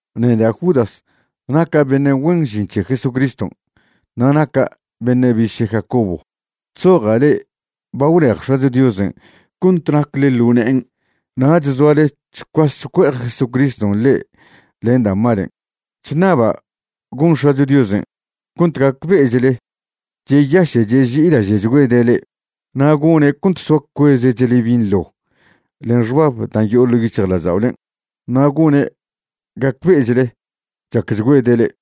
Neda' Judas naca' beṉe' güen žin c̱he Jesucriston', na' naca' beṉe' biše' Jacobo. Chzoja' le'e ba gwlej X̱acho Diosen' cont nacle ḻo ne'en nach zoale chcuas chcue'ej Jesucriston' le'e len da' malen'. Chṉaba' gon X̱acho Diosen' cont gacbe'echle cheyaše' cheži'ilaže'chgüede' le'e, na' gone' cont soa cuezechle binḻo len xbab da' yo'o ḻo' yic̱hjlažda'olen', na' gone' gacbe'echle chacchgüede' le'e.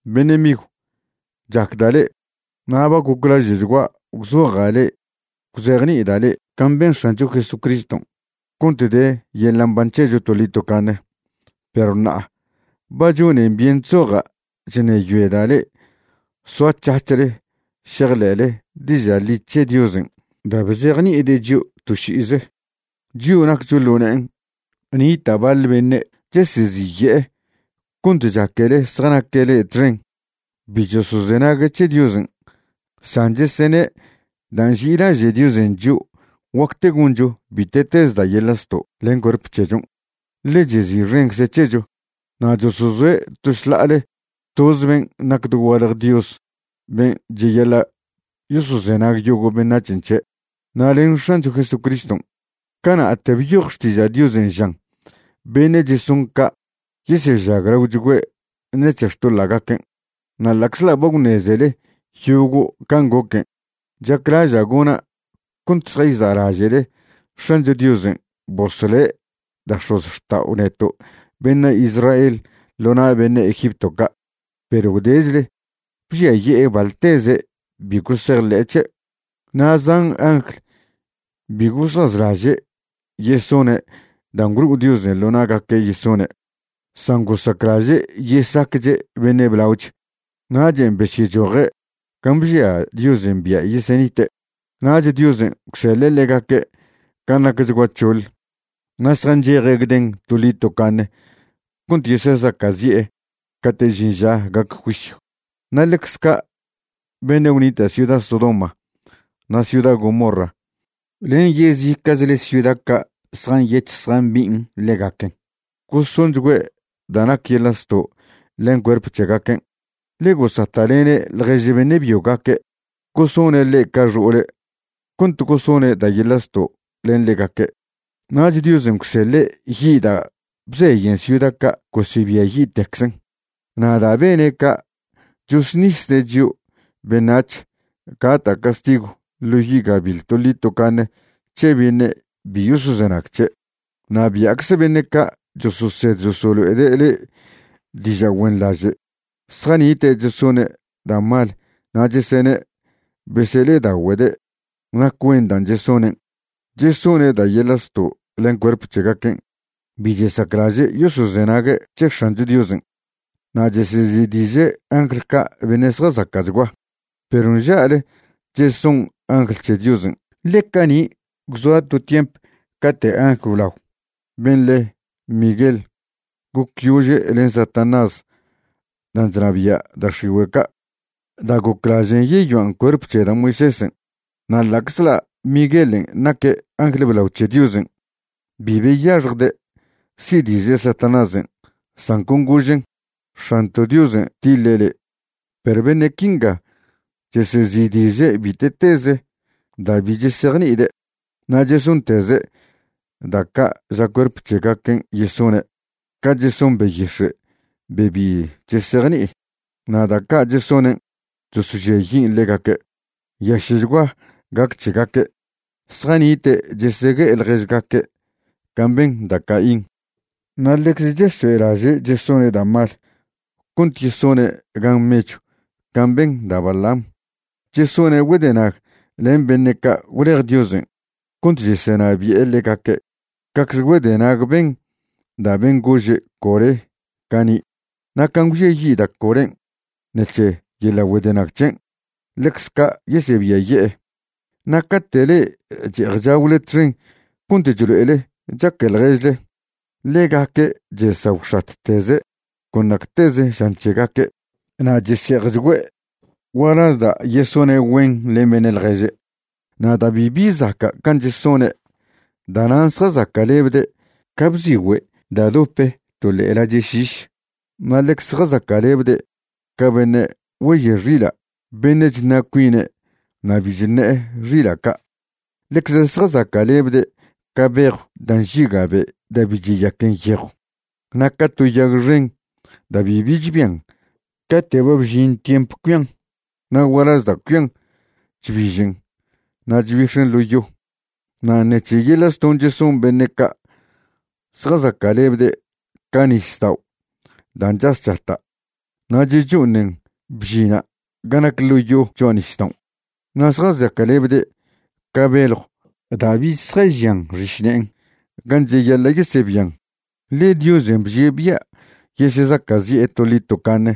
Beṉe' migw, chacda' le'e, na' ba goclaže'chgua' gwzoja' le'e gwzejni'ida' le'e can' ben X̱ancho Jesucriston' cont de yeḻa' mban c̱hecho toḻi tocaṉe. Perw ṉa'a ba chonen byen chzoja' chṉeyoeda' le'e soac̱hac̱hle šejḻe'le diža' ḻi c̱he Diosen' da' bzejni'ide' chio' to ši'ize, chio' naccho ḻo ne'en. Nita' baḻ beṉe' cheseziye'e cont chaquele zjanaque' le'e txen. Bi chosozenague' c̱he Diosen', san chesene' da' nži'ilaže' Diosen' chio' guacte goncho bite'teze da' yeḻa' zto' len cuerp c̱hechon', ḻe chezi'xencze' c̱hecho. Na' chosozoe' to šḻa'ale toz ben' nac dogualje Dios ben' cheyaḻa' yosozenag yogo' beṉac̱hen' c̱he', na' len X̱ancho Jesucriston'. Cana'te byoj Xtiža' Diosen' žan beṉe' cheson ca' yesežaglaochgüe' ṉec̱he xtoḻa'gaquen'. Na' ḻa'czḻa' ba gwṉezele yogo' can' goquen', chaclaža' gona' cont šjayza'laže'le X̱ancho Diosen' bosle' da' x̱ozxta'o neto' beṉe' Israel ḻo na' beṉe' Egipto ca', perw gwdechle bžiaye'e baḻteze' bi gosejḻe'e c̱he'. Na' zan angl bi gosazlaže' yesone' da' gwlo'o Diosen' ḻo na'gaque' yesone', san gosaclaže' yesacche' beṉe' blaoch. Nachen' besyechoje' gan' bžia Diosen' bia' yesenite'. Nach Diosen' gwseḻe' ḻegaque' gan' nacchgua c̱hoḻ, na' zjancheje' gden toḻi tocaṉe cont yesezaca'zi'e cate' žin ža gac juisyw. Na' ḻecze ca' beṉe' gwnita' ciuda Sodoma na' ciuda Gomorra len yezica'chle ciuda ca' zjanyec̱hj zjambi'in ḻegaquen, gosonchgüe' da' nac yeḻa' zto' len cuerp c̱hegaquen', ḻe gosata'lene' ḻjež beṉe' byogaque' gosone' ḻe' ca xo'ole' cont gosone' da' yeḻa' zto' len ḻegaque'. Nach Diosen' gwseḻe' yi' da' bzeyen ciuda ca' gosebiayi'tecczen'. Na' da' bene' ca', chosṉisde' chio' beṉac̱h gata' castigw ḻo yi' gabiḻ toḻi tocaṉe c̱he beṉe' bi yosozenag c̱he'. Na' bia'cze beṉe' ca' chososed chosolo'ede' le'e diža' güenḻaže', zjanite' chesone' da' mal na' chesene' besele'edagüede' nac güen dan' chesonen'. Chesone' da' yeḻa' zto' len cuerp c̱hegaquen' bi chesaclaže' yosozenague' c̱he X̱ancho Diosen', na' chesezi'diže' angl ca' beṉe' zjazaca'chgua. Perw nža'le cheson angl c̱he Diosen', ḻe cani' gwzoa to tiemp cate' angl blao ben' le Miguel gocyože' len Satanás dan' chnabia' da' x̱igüe' ca' da' goclažen' yeyoan' cuerp c̱he da' Moisésen'. Na' ḻa'czḻa' Miguelen' naque' angl blao c̱he Diosen', bi beyaxjde' si'diže' Satanásen', san con gožen': “X̱anto' Diosen' tiḻe' le'.” Perw beṉe' quinga chesezi'diže' bite'teze da' bi chesejni'ide'. Na' chesonteze' da' ca' ža cuerp c̱hegaquen' yesone', ca cheson beyix̱e' be bi chesejni'i, na' da' ca' chesonen' chosožiayin' ḻegaque'. Nyaše'chgua gac c̱hegaque'. Zjanite' chesegue'e ḻježgaque' can' ben da' Caín, na' ḻecze chesoe'laže' chesone' da' mal cont yesone' gan mechw can' ben da' Balaam. Chesone' güedenag len beṉe' ca' gwlej Diosen' cont chesenabi'e ḻegaque' cacze güedenag ben da' ben' gože' Coré cani', na' can' gwžiayi' da' Corén' ṉec̱he yeḻa' güedenag c̱hen', ḻecz ca' yesebiaye'e. Na' cate' le'e che'ej chagwle txen cont chlo'ele chaque ḻježle, ḻegaque' chesagwxatteze' con nacteze žan c̱hegaque' na' chese'ejchgüe' gualaz da' yesone' güen len beṉe' ḻježe'. Na' da' bibi zaca' can' chesone', da'nan' zjazaca'lebde' ca bzigüe' da' dope to ḻe'e lache' šiš, na' ḻecze zjazaca'lebde' ca beṉe' güeye' xila' beṉe' chṉa' cuine' na' bi chṉe'e xila' ca'. Ḻecze zjazaca'lebde' ca bejw da' nžiga' be' da' bi cheyaquen yejw, na' ca to yag xen da' bibi chbian cate' ba bžin tiemp cuian, na' gualaz da' cuian chbižen na' chbix̱en ḻo yo. Na' ṉec̱he yeḻa' zton' cheson beṉe' ca', zjazaca'lebde' ca nisdao' da' chas chata' na' checho'onen bžina' ga nac ḻo yo cho'a nisdaon'. Na' zjazaca'lebde' ca beljw da' bich zjažian xišne'en gan' cheyaḻa' yesebian, ḻe Diosen' bžie' bia' yesezaca'zi'e toḻi tocaṉe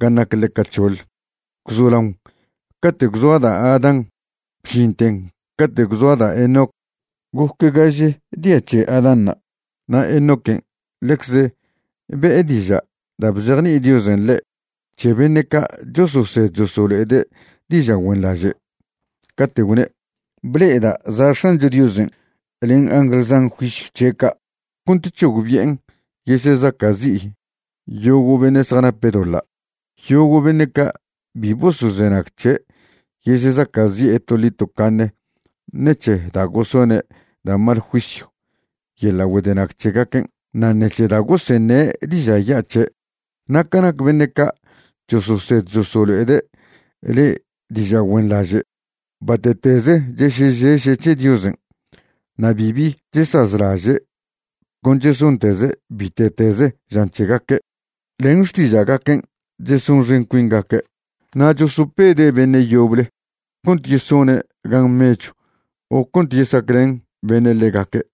gan' nac ḻeca c̱hoḻ. Gwzolaon cate' gwzoa da' Adán bžinten cate' gwzoa da' Enoc goc gaže dia c̱he Adánṉa'. Na' Enoquen' ḻecze be'e diža' da' bzejni'i Diosen' ḻe' c̱he beṉe' ca' chososed chosolo'ede' diža' güenḻaže', cate' gwne': “Ble'eda' za' X̱ancho Diosen' len angl zan juisyw c̱he' ca' cont c̱hogbi'en yesezaca'zi' yogo' beṉe' zjanape' doḻa'. Yogo' beṉe' ca' bi bosozenag c̱he' yesezaca'zi'e toḻi tocaṉe ṉec̱he da' gosone' da' mal juisyw yeḻa' güedenag c̱hegaquen' na' ṉec̱he da' goseṉe' diža' ya' c̱he'.” Na' ca nac beṉe' ca' chososed chosolo'ede' le'e diža' güenḻaže', bate'teze chesežeše' c̱he Diosen', na' bibi chesazlaže'. Con chesonteze' bite'teze žan c̱hegaque'. Len xtiža'gaquen' chesonxen cuingaque' na' chosopede' beṉe' yoble cont yesone' gan mechw o cont yesaclen beṉe' ḻegaque'.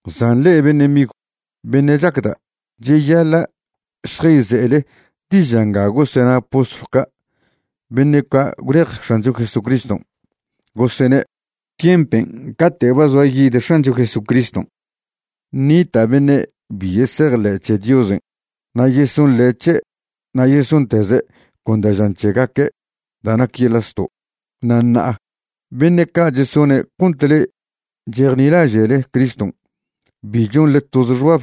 San le'e beṉe' migw, beṉe' chacda', cheyaḻa' šjayze'ele diža' nga gosena postlw ca' beṉe' ca' gwlej X̱ancho Jesucriston'. Gosene': “Tiempen' cate' ba zoa yid X̱ancho Jesucriston', ṉita' beṉe' bi yesejḻe' c̱he Diosen' na' yesonḻe' c̱he' na' yesonteze' con da' žan c̱hegaque' da' nac yeḻa' zto'.” Na' ṉa'a beṉe' ca' chesone' cont le'e chejnilaže'le Criston' bi chonḻe toze xbab,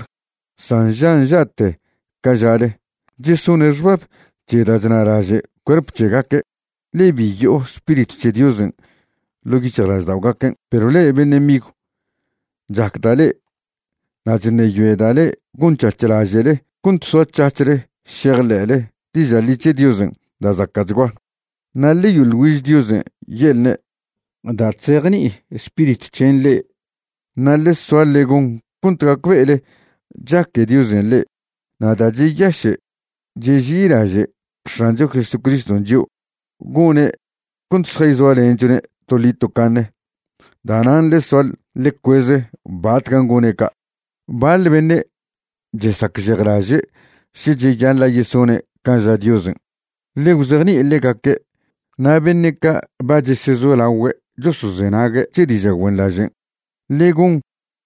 san nža' nža'te ca žale. Chesone' xbab c̱he da' chnalaže' cuerp c̱hegaque', ḻe bi yo'o Spiritw c̱he Diosen' ḻo' yic̱hjlažda'ogaquen'. Perw le'e beṉe' migw, chacda' le'e, na' chṉeyoeda' ḻe gonc̱hac̱h laže'le cont soac̱hac̱hle šejḻe'le diža' ḻi c̱he Diosen' da' zaca'chgua. Na' ḻe yoḻ güiž Diosen' ye'lne' da' chzejni'i Spiritw c̱hen' le'e. Na' ḻe soa ḻe gon cont gacbe'ele chaque Diosen' le'e. Na' da' cheyaše' cheži'ilaže' X̱ancho Jesucriston' chio', gone' cont šjayzoalenchone' toḻi tocaṉe. Da'nan' ḻe soa ḻe cueze batcan' gone' ca'. Baḻ beṉe' chesacžejlaže' še cheyaḻa' yesone' can' ža Diosen'. Ḻe gwzejni'i ḻegaque'. Na' beṉe' ca' ba chesezolagüe' chosozenague' c̱he diža' güenḻažen', ḻe gon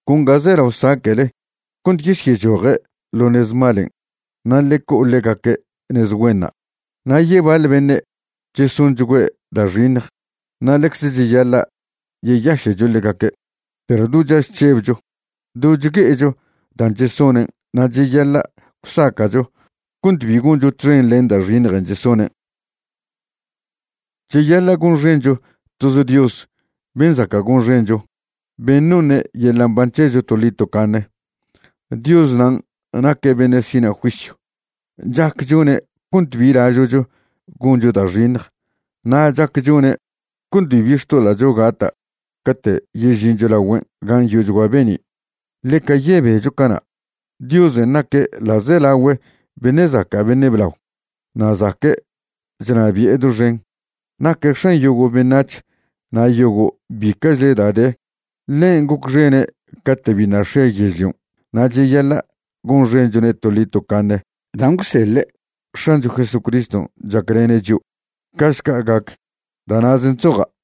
con ga zelao saca'le cont yesyechoje' ḻo nez malen' na' ḻe co'o ḻegaque' nez güenṉa'. Na' yebaḻ beṉe' chesonchgüe' da' xiṉj, na' ḻecze cheyaḻa' yeyaše'cho ḻegaque', perw do chaž chžebcho, do chgue'echo dan' chesonen' na' cheyaḻa' gwsaca'cho cont bi goncho txen len da' xiṉjen' chesonen'. Cheyaḻa' gonxencho toz Dios ben' zaca' gonxencho, ben' noṉe' yeḻa' mban c̱hecho toḻi tocaṉe. Dios nan' naque' beṉe' sina' juisyw. Chac chone' cont bi lažo'cho goncho da' xiṉj, na' chac chone' cont bibi xtoḻa'cho gata' cate' yežincho lagüen' gan' yo'ochgua be'ni'. Ḻeca yebecho cana'. Diosen' naque' ḻa'zelagüe beṉe' zaca' beṉe' blao, na' zaque' chnabi'e doxen. Naque' X̱an yogo' beṉac̱h na' yogo' bica'chle da' de. Ḻen' gocxene' cate' biṉa' x̱e yežlion' na' cheyaḻa' gonxenchone' toḻi tocaṉe dan' gwseḻe' X̱ancho Jesucriston' chaclene' chio'. Ca'šca gac. Da' na'zen' chzoja'.